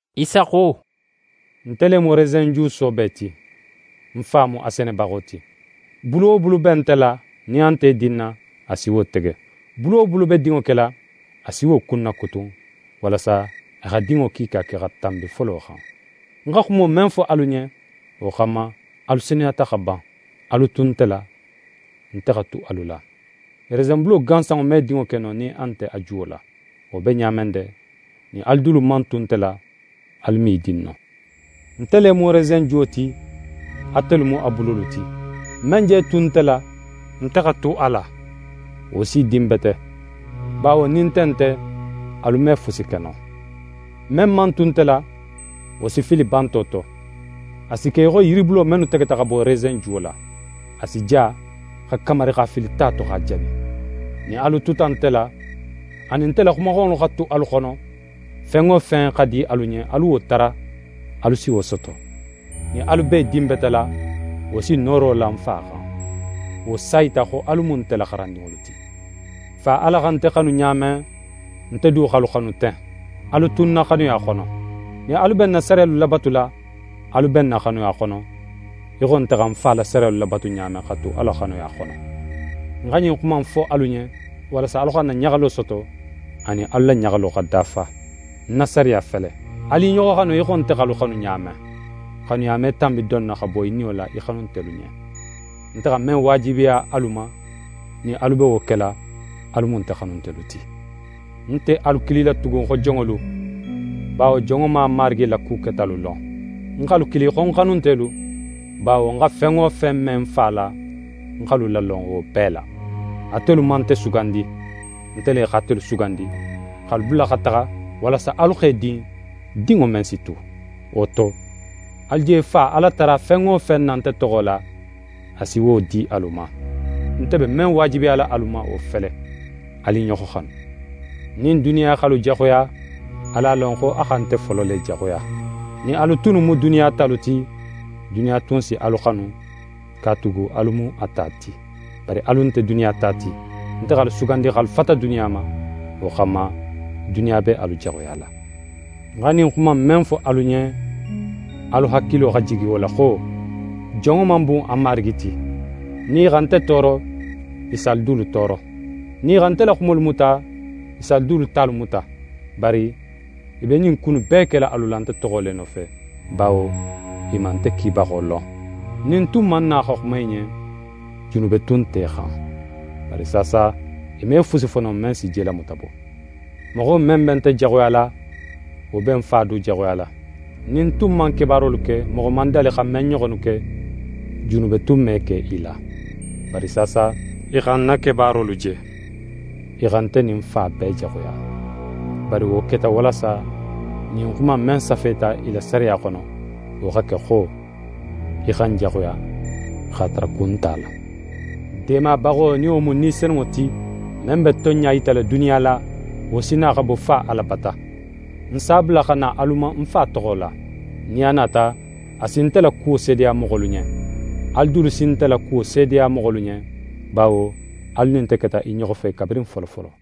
Isa xo: «Nte le mu resenju soobe ti. Ń Fa mu a senebaxo ti. Bulu wo bulu be nte la, nin a nt'é dinna, a si wo tege. Bulu wo bulu be dinŋo kela, a si wo kunnakutun, walasa a xa dinŋo kiika ke, xa tanbi folo xan. Ń xa xumo men fo alu ɲen, wo xanma, alu senuyata xa ban. Alu tu nte la, nte xa tu alu la. Resenbulo gansanŋo me dinŋo ke no nin a nte a juwo la. Wo be ɲa men de, nin alu dulu man tu nte la, alu me í din no. «Nte le mu resenjuwo ti, atelu mu a bulolu ti. Men je tu nte la, nte xa tu a la, wo s'í din bete, bawo nin nte nte, alu me fusi ke no. Men man tu nte la, wo si fili banto to. A si ke í xo yiribulo mennu tegeta xa bo resenjuwo la. A si ja, xa kamari x'a fili ta to, x'a jani. Nin alu tuta nte la, anin nte la xumaxanŋolu xa tu alu xono, fen wo fen xa di alu ɲen, alu wo tara, alu si wo soto. Nin alu b'é dinbetela, wo si nooro la ń Fa xan. Wo s'a yita xo alu mu nte la xarandinŋolu ti. Fa Ala xa nte xanu ɲa men, nte du x'alu xanu ten. Alu tu ń na xanuya xono. Nin alu be ń na sariyalu labatula, alu be ń na xanuya xono, í xo nte xa ń Fa la sariyalu labatu ɲa men, xa tu a la xanuya xono. «Ń xa ɲin xuma innu fo alu ɲen, walasa alu xa ń na ɲaxalo soto, anin alu la ɲaxalo xa dafa. Ń na sariya fele: “Alu i ɲoxo xanu í xo nte x'alu xanu ɲa men.” Xanuya me tanbi don na, xa bo í niyo la í xanuntelu ɲen. Nte xa men waajibiya alu ma, nin alu be wo kela, alu mu nte xanuntelu ti. Ń nte alu kilila tugun xo jonŋolu, bawo jonŋo man a marigi la ku ketalu lon. Ń x'alu kili xo ń xanuntelu, bawo ń xa fen wo fen me ń Fa la, ń x'alu lalon wo bee la. Atelu man nte sugandi. Nte le x'atelu sugandi, x'alu bula, xa taxa, walasa alu x'e din, dinŋo men si tu. Wo to, alu je Fa Ala tara fen wo fen na nte toxo la, a si wo di alu ma. Nte be men waajibiyala alu ma, wo fele: Alu i ɲoxo xanu.» «Nin duniya x'alu jaxuya, alu a lon, xo a xa nte folo le jaxuya. Nin alu tunnu mu duniya talu ti, duniya tun si alu xanu, katugu alu mu a ta ti. Bari alu nte duniya ta ti, nte x'alu sugandi x'alu fata duniya ma, wo xanma, duniya be alu jaxuyala. Ń xa ɲin xuma in men fo alu ɲen, alu hakilo xa jigi wo la xo: “Jonŋo man bun a marigi ti.” Nin i xa nte tooro, i si alu dulu tooro. Nin i xa nte la xumolu muta, i si alu dulu talu muta. Bari i be ɲin ku innu bee kela alu la nte toxo le nofe, bawo i man nte kibaxo lon. Nin ń tun man na xa xuma i ɲen, junube tun nt'e xan. Bari saasa, i me fusi fo no men si jelamuta bo. Moxo men be nte jaxuyala, wo be ń Fa du jaxuyala. Nin ń tun man kebaarolu ke, moxo man dali xa men ɲoxonnu ke, junube tun me ke i la. Bari saasa, i xa ń na kebaarolu je, i xa nte nin ń Fa bee jaxuya. Bari wo keta walasa ɲin xuma in, men safeta i la sariya xono, wo xa ke xo: “I xa ń jaxuya, x'a tara kun nt'a la.” «Deemabaxo, nin wo mu Ni Senunŋo ti, men be tonɲa yitala duniya la, wo si na, xa bo Fa Ala bata. Ń s'a bula xa na alu ma ń Fa toxo la. Nin a nata, a si nte la kuwo seedeya moxolu ɲen. Alu dulu si nte la kuwo seedeya moxolu ɲen, bawo alu nin nte keta i ɲoxo fe kabirin folofolo.»